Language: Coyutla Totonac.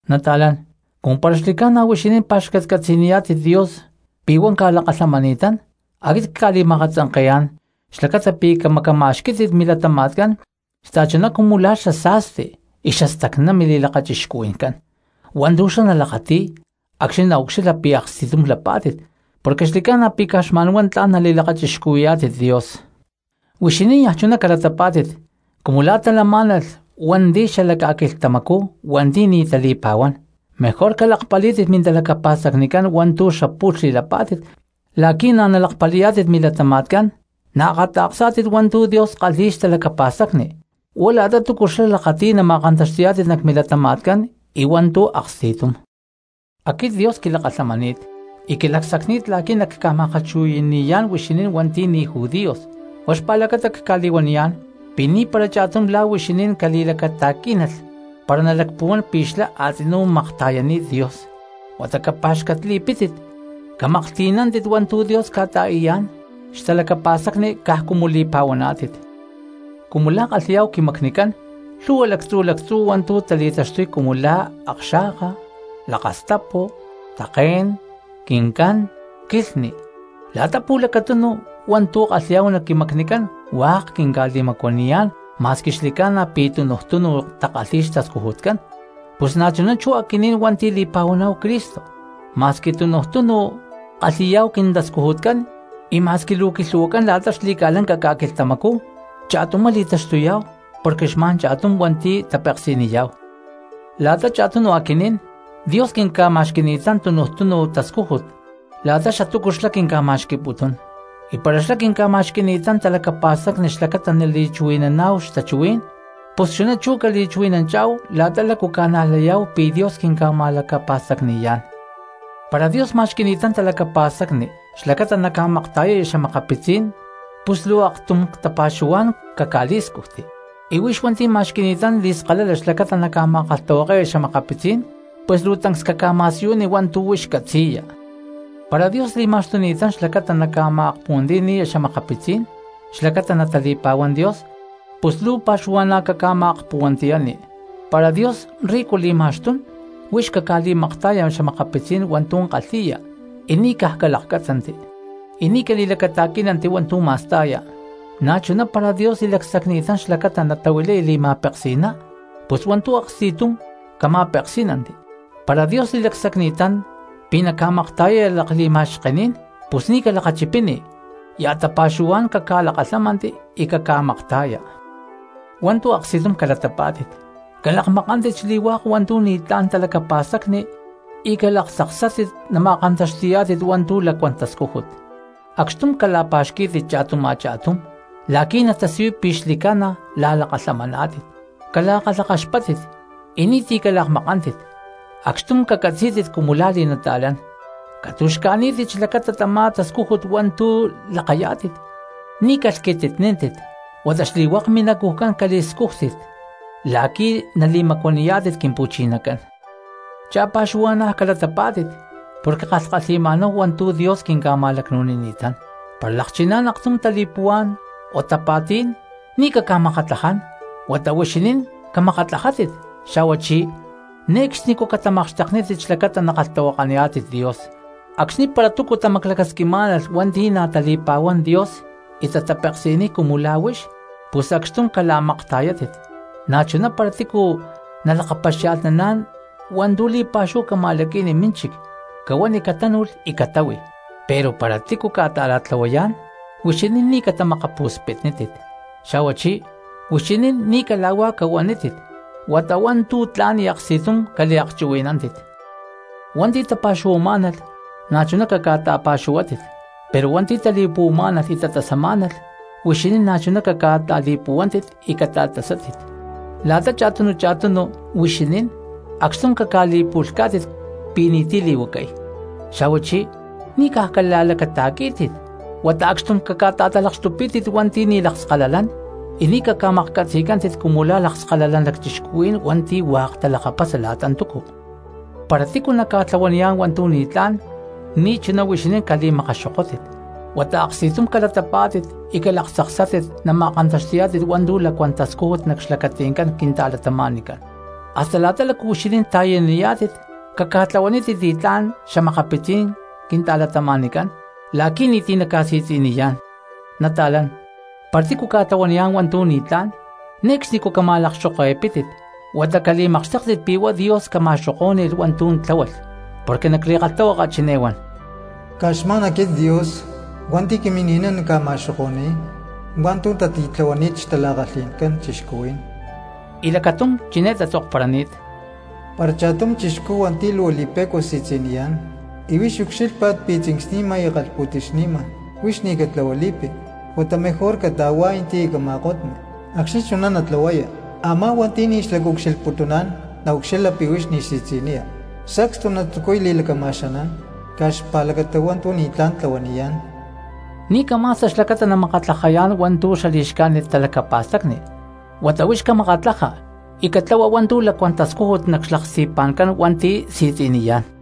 Nata̠lán, cumu para xli̠ca̠na huixinín pa̠xcatcatzi̠niyá̠tit Dios pi̠ huá ca̠lakalhamani̠tán, aquit cca̠li̠ma̠akatzanke̠yá̠n xlacata pi̠ camacama̠xquí̠tit milatama̠tcán xta̠chuná cumu la̠ xasa̠sti y xastacná mili̠lakachixcuhui̠ncán hua̠ntu̠ xlá nalakati̠y acxni̠ naucxilha pi̠ aksti̠tum lapá̠tit, porque xli̠ca̠na pi̠ caj xma̠n huá tla̠n nali̠lakachixcuhuí̠yá̠tit Dios. Huixinín niaj chuná calatapá̠tit cumu la̠ talamá̠nalh a̠ma̠ko̠lh cati̠hua̠ cristianos xala ca̠quilhtamacú hua̠nti̠ ni̠ tali̠pa̠huán; mejor calakpalí̠tit mintalacapa̠stacnicán hua̠ntu̠ xapu̠lh xli̠lapá̠tit la̠qui̠ na̠ nalakpali̠yá̠tit milatama̠tcán, la̠qui̠ naakata̠ksá̠tit hua̠ntu̠ Dios kalhi̠y xtalacapa̠stacni, huá la̠ta túcu xlá lakati̠y nama̠kantaxti̠yá̠tit nac milatama̠tcán y hua̠ntu̠ aksti̠tum. Aquit Dios quilakalhamani̠t y quilacsacni̠t la̠qui̠ nacca̠ma̠kalhchuhui̠ni̠yá̠n huixinín hua̠nti̠ ni̠ judíos, huá xpa̠lacata cca̠li̠huaniyá̠n pi̠ ni̠para cha̠tum la̠ huixinín cali̠lacata̠quí̠nalh para nalacpuhuán pi̠ xlá a̠tzinú makta̠yani̠t Dios, huata capa̠xcatli̠pítit camaklhti̠nántit hua̠ntu̠ Dios ca̠ta̠i̠yá̠n xtalacapa̠stacni caj cumu li̠pa̠huaná̠tit. Cumu la̠ kalhi̠yá̠hu quimacnicán, lhu̠hua lactzu̠ lactzú hua̠ntu̠ tali̠taxtuy cumu la̠ akxa̠ka, lakastapu, také̠n, quincán, quilhni, la̠ta pu̠lacatunu hua̠ntu̠ kalhi̠yá̠hu nac quimacnicán hua̠k quinca̠li̠macuaniyá̠n ma̠squi xli̠ca̠na pi̠ tunuj túnu takalhi̠y xtascujutcán. Pus na̠chuná chú aquinín hua̠nti̠ li̠pa̠huaná̠hu Cristo, ma̠squi tunuj túnu kalhi̠yá̠hu quintascujutcán y ma̠squi luu quilhu̠huacán la̠ta xli̠ca̠lanca ca̠quilhtamacú xli̠ca̠na pi̠ cha̠tumá li̠taxtuyá̠hu porque xma̠n cha̠tum hua̠nti̠ tapeksi̠niyá̠hu. La̠ta cha̠tunu aquinín Dios quinca̠ma̠xqui̠ni̠tán tunuj túnu tascújut la̠ta xatúcu xlá quinca̠ma̠xqui̠putún, y para xlá quinca̠ma̠xqui̠ni̠tán talacapa̠stacni xlacata nali̠chuhui̠naná̠hu xtachuhuí̠n, pus chuná cali̠chuhui̠nanchá̠hu la̠ta lácu ca̠najlayá̠hu pi̠ Dios quinca̠ma̠lacapa̠stacni̠yá̠n. Para Dios ma̠xqui̠ni̠tán talacapa̠stacni xlacata naca̠makta̠yaya xa̠makapitzí̠n cristianos, pus luu aktum tapa̠xuhuá̠n caca̠li̠scujti. Y huix hua̠nti̠ ma̠xqui̠ni̠tán li̠skalala xlacata naca̠ma̠kalhtahuake̠ya xa̠makapitzí̠n, pus luu tancs caca̠ma̠siyuni hua̠ntu̠ huix catzi̠ya. Y para Dios li̠ma̠xtuni̠tán xlacata naca̠ma̠akpuhuantiyani̠ya xa̠makapitzí̠n xlacata natali̠pa̠huán Dios, pus luu cali̠pa̠xuhu caca̠ma̠akpuhuantiyani. Para Dios rico li̠ma̠xtún, huix caca̠li̠makta̠ya xa̠makapitzí̠n hua̠ntu̠ kalhi̠ya y ni̠ caj calakcátzanti y ni̠ cali̠lacata̠quí̠nanti hua̠ntu̠ ma̠sta̠ya. Na̠chuná para Dios li̠lacsacni̠tán xlacata natahuilaya li̠ma̠peksi̠ná, pus hua̠ntu̠ aksti̠tum cama̠peksí̠nanti. Para Dios li̠lacsacni̠tán pi̠ naca̠makta̠yaya lakli̠ma̠xkení̠n, pus ni̠ calakachipini ya̠ tapa̠xuhuá̠n caca̠lakalhámanti y caca̠makta̠ya. Hua̠ntu̠ aksti̠tum cala̠pa̠xquí̠tit, calakmakántit xli̠hua̠k hua̠ntu̠ ni̠tlá̠n talacapa̠stacni y calaktzaksátit nama̠kantaxti̠yá̠tit hua̠ntu̠ lacuán tascújut. Acxtum cala̠pa̠xquí̠tit cha̠tum a̠cha̠tum la̠qui̠ natasiyuy pi̠ xli̠ca̠na la̠lakalhamaná̠tit, cala̠kalhakaxpáttit y ni̠ti̠ calakmakántit, acxtum cacatzí̠tit cumu la̠ li̠nata̠lán. Catu̠xca̠ní̠tit xlacata tamá tascújut hua̠ntu̠ lakayá̠tit, ni̠ calhquititníntit huata xli̠hua̠k minacujcán cali̠scújtit la̠qui̠ nali̠macuaniyá̠tit Quimpu̠chinacán. Cha̠pa̠xuhua̠na̠ calatapá̠tit porque kalhkalhi̠ma̠náhu hua̠ntu̠ Dios quinca̠ma̠lacnu̠nini̠tán; para lakchiná̠n aktum tali̠puhuá̠n o tapa̠tí̠n ni̠ caca̠makatlaján huata huixinín camakatlajátit; xa̠huachí ne̠cxnicú catamakxteknítit xlacata nakalhtahuakaniyá̠tit Dios. Acxni̠ para túcu tamaclacasquimá̠nalh hua̠nti̠ na̠ tali̠pa̠huán Dios y tatapeksi̠niy cumu la̠ huix, pus acxtum cala̠makta̠yátit; na̠chuná para tícu nalakapaxia̠lhnán hua̠ntu̠ li̠pa̠xúhu cama̠laqui̠ni mínchic cahuani catánu̠lh y catáhui. Pero para tícu ca̠ta̠ra̠tlahuayá̠n huixinín ni̠ catamakapu̠spitnítit, xa̠huachí huixinín ni̠ cala̠huá cahuanítit huata hua̠ntu̠ tla̠n y aksti̠tum caliakchuhuí̠nanti. Hua̠nti̠ tapa̠xuhuamá̠nalh, na̠chuná caca̠ta̠pa̠xuhuátit; pero hua̠nti̠ tali̠puhuamá̠nalh y tatasamá̠nalh, huixinín na̠chuná caca̠ta̠li̠puhuántit y catasátit. La̠ta cha̠tunu cha̠tunu cristianos huixinín acxtum caca̠li̠pu̠lhcá̠tit pi̠ ni̠ti̠ li̠huacay; xa̠huachí ni̠ caj cala̠lacata̠quí̠tit huata acxtum caca̠ta̠talakxtupí̠tit hua̠nti̠ ni̠ lakskalalán, y ni̠ caca̠maklhcatzi̠cántit cumu la̠ lakskalalán lacchixcuhuí̠n hua̠nti̠ hua̠k talakapasa la̠ta túcu. Para tícu naca̠tlahuaniyá̠n hua̠ntu̠ ni̠tlá̠n ni̠chuná huixinín cali̠makaxokótit, huata aksti̠túm calatapá̠tit y calaktzaksátit nama̠kantaxti̠yá̠tit hua̠ntu̠ lacuán tascújut nac xlacatí̠n cristianos. Hasta la̠ta lácu huixinín ta̠yaniyá̠tit caca̠tlahuanítit li̠tlá̠n cristianos la̠qui̠ ni̠ti̠ naca̠si̠tzi̠niyá̠n. Nata̠lán, para tícu ca̠tlahuaniyá̠n hua̠ntu̠ ni̠tlá̠n ne̠cxnicú cama̠lakxoke̠pítit, huata cali̠makxtéktit pi̠ huá Dios ca̠ma̠xokó̠ni̠lh hua̠ntu̠ tláhualh, porque nac li̠kalhtahuaka chiné huán: “Caj xma̠n aquit Dios hua̠nti̠ quimini̠niy nacca̠ma̠xoko̠ni̠y hua̠ntu̠ tati̠tlahuani̠t xtala̠kalhi̠ncán cristianos.” Y lacatum chiné tatzokparani̠t: “Para cha̠tum cristiano hua̠nti̠ luu li̠pe̠cua si̠tzi̠niyá̠n y huix ucxílhpa̠t pi̠ tzincsni̠ma y kalhpu̠ti̠xni̠ma, huix ni̠ catlahuali̠pi huata mejor cata̠huá̠yanti y cama̠kotni. Acxni̠ chuná natlahuaya, a̠má hua̠nti̠ ni̠ xlacaucxilhputuná̠n naucxilha pi̠ huix ni̠ si̠tzi̠niya, sacstu natzucuy li̠lacama̠xanán caj xpa̠lacata hua̠ntu̠ ni̠tlá̠n tlahuaniyá̠n.” Ni̠ cama̠sta xlacata namakatlajayá̠n hua̠ntu̠ xali̠xcájnit talacapa̠stacni, huata huix camakatlaja porque catlahua hua̠ntu̠ lacuán tascújut nac xlaksti̠pa̠ncán hua̠nti̠ si̠tzi̠niyá̠n.